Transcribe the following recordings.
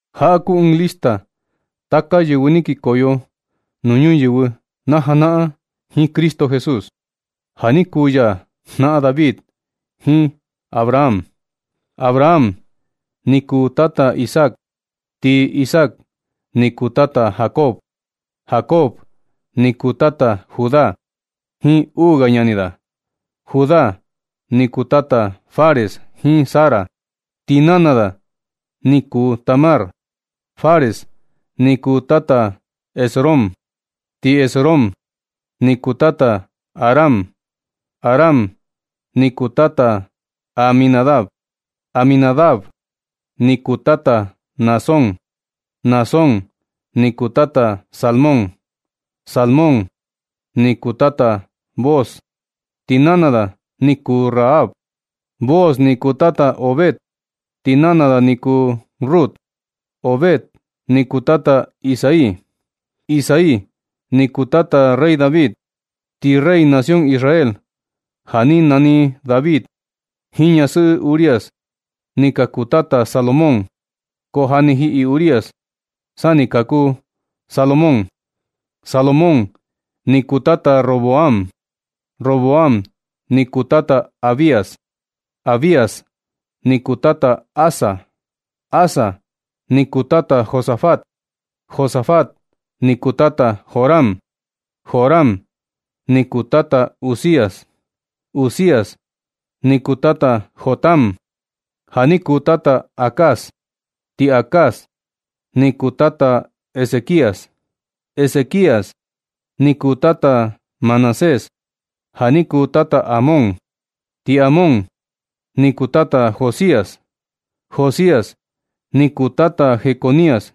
Jaꞌa kuu ɨɨn lista taka yɨvɨ ni kikoyo nuu ñuyɨvɨ na janaꞌan jiin Cristo Jesús, ja ni kuu ya jnaꞌan David jiin Abraham. Abraham ni kuu tata Isaac, ti Isaac ni kuu tata Jacob. Jacob ni kuu tata Judá jiin uu ga ñani da. Judá ni kuu tata Fares jiin Zara, ti nana da ni kuu Tamar. Fares ni kuu tata Esrom, ti Esrom ni kuu tata Aram. Aram ni kuu tata Aminadab, Aminadab ni kuu tata Naasón, Naasón ni kuu tata Salmón. Salmón ni kuu tata Booz, ti nana da ni kuu Rahab. Booz ni kuu tata Obed, ti nana da ni kuu Rut. Obed ni kuu tata Isaí. Isaí ni kuu tata rey David, ti rey nación Israel ja ni nani David jiin ñasɨꞌɨ Urías, ni ka kuu tata Salomón, ko ja ni jiꞌi Urías sa ni kaku Salomón. Salomón ni kuu tata Roboam, Roboam ni kuu tata Abías, Abías ni kuu tata Asa. Asa ni kuu tata Josafat, Josafat ni kuu tata Joram, Joram ni kuu tata Uzías. Uzías ni kuu tata Jotam, ja ni kuu tata Acaz, ti Acaz ni kuu tata Ezequías. Ezequías ni kuu tata Manasés ja ni kuu tata Amón, ti Amón ni kuu tata Josías. Josías ni kuu tata Jeconías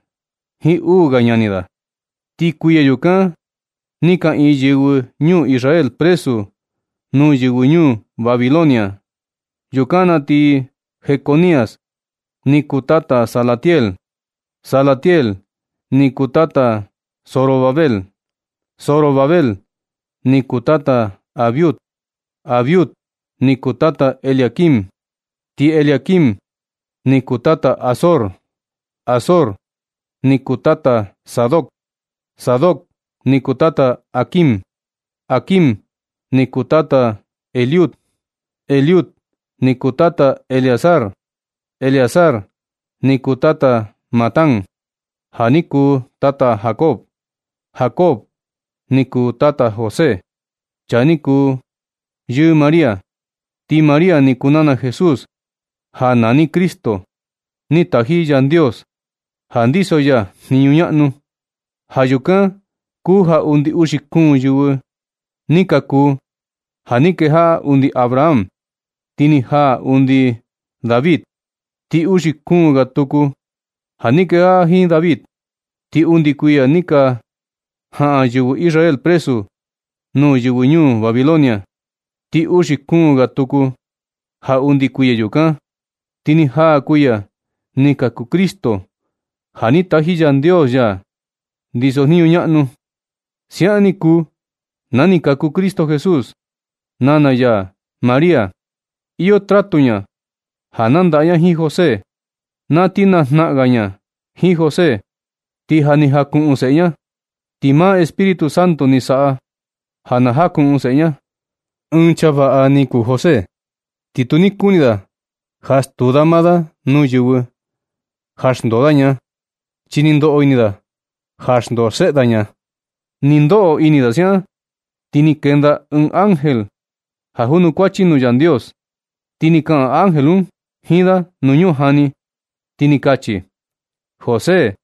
jiin uu ga ñani da. Ti kuiya yukan ni kaꞌiin yɨvɨ ñuu Israel presu nuu yɨvɨ ñuu Babilonia. Yukan na ti Jeconías ni kuu tata Salatiel, Salatiel ni kuu tata Zorobabel, Zorobabel ni kuu tata Abiud, Abiud ni kuu tata Eliaquim, ti Eliaquim ni kuu tata Azor. Azor ni kuu tata Sadoc, Sadoc ni kuu tata Aquim, Aquim ni kuu tata Eliud. Eliud ni kuu tata Eleazar, Eleazar ni kuu tata Matán, ja ni kuu tata Jacob. Jacob ni kuu tata José, chaa ni kuu yɨɨ María. Ti María ni kuu nana Jesús ja nani Cristo, ni taji Yandios ja ndiso ya jniñu ñaꞌnu. Ja yukan kuu ja undi uxi kuun yɨvɨ ni ka kuu ja ni kejaꞌa undi Abraham ti ni jaa undi David, ti uxi kuun ga tuku ja ni kejaꞌa jiin David, ti undi kuiya ni ka jaꞌan yɨvɨ Israel presu nuu yɨvɨ ñuu Babilonia. Ti uxi kuun ga tuku ja undi kuiya yukan, ti ni jaa kuiya ni kaku Cristo, ja ni taji Yandios ya, ndiso jniñu ñaꞌnu. Siaꞌan ni kuu na ni kaku Cristo Jesús. Nana ya María, iyo tratu ña ja nandaꞌa ña jiin José. Na ti najnaꞌan ga ña jiin José, ti ja ni jakuꞌun seꞌe ña. Ti maa Espíritu Santo ni saꞌa ja na jakuꞌun seꞌe ña. Ɨɨn chaa vaꞌa ni kuu José, ti tu ni kuni da ja stuu da maa da nuu yɨvɨ ja xndoo da ña, chi ni ndoꞌo ini da ja xndoo xeꞌe da ña. Ni ndoꞌo ini da siaꞌan, ti ni kenda ɨɨn ángel ja junukuachi nuu Yandios. Ti ni kaꞌan ángel un jiin da nuu ñujani, ti ni kachi: ―José,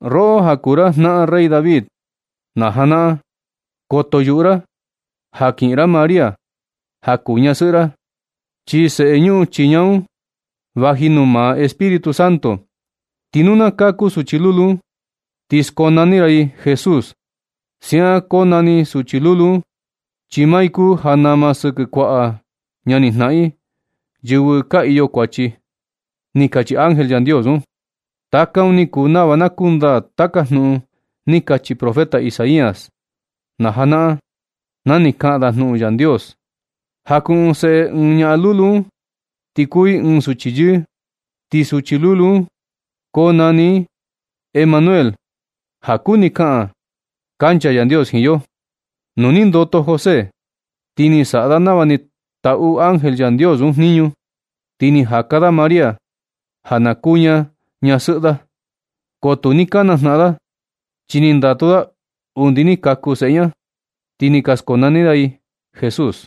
roꞌo ja kuu ra jnaꞌan rey David na janaꞌan, koto yuꞌu ra ja kiꞌin ra María ja kuu ñasɨꞌɨ ra, chi seꞌe ñuꞌun chii ña un vaji nuu maa Espíritu Santo. Ti nu na kaku suchi lulu un, ti skonani ra i Jesús. Siaꞌan konani suchi lulu un chi maa i kuu ja nama sɨkɨ kuaꞌa ñanijnaꞌan i, yɨvɨ ka iyo kuachi ―ni kachi ángel Yandios un. Taka un ni kuu nava na kundaa taka jnuꞌun ni kachi profeta Isaías na janaꞌan, na ni kaꞌan da jnuꞌun Yandios: Jakuꞌun seꞌe ɨɨn ñaꞌan lulu un, ti kuu i ɨɨn suchi yɨɨ. Ti suchi lulu un konani i Emanuel, ja kuni kaꞌan: “Kancha Yandios jiin yo.” Nu ni ndoto José, ti ni saꞌa da nava ni taꞌu ángel Yandios un jniñu. Ti ni jaka da María ja na kuu ña ñasɨꞌɨ da. Ko tu ni ka najnaꞌan da, chi ni ndatu da undi ni kaku seꞌe ña. Ti ni ka skonani da i Jesús.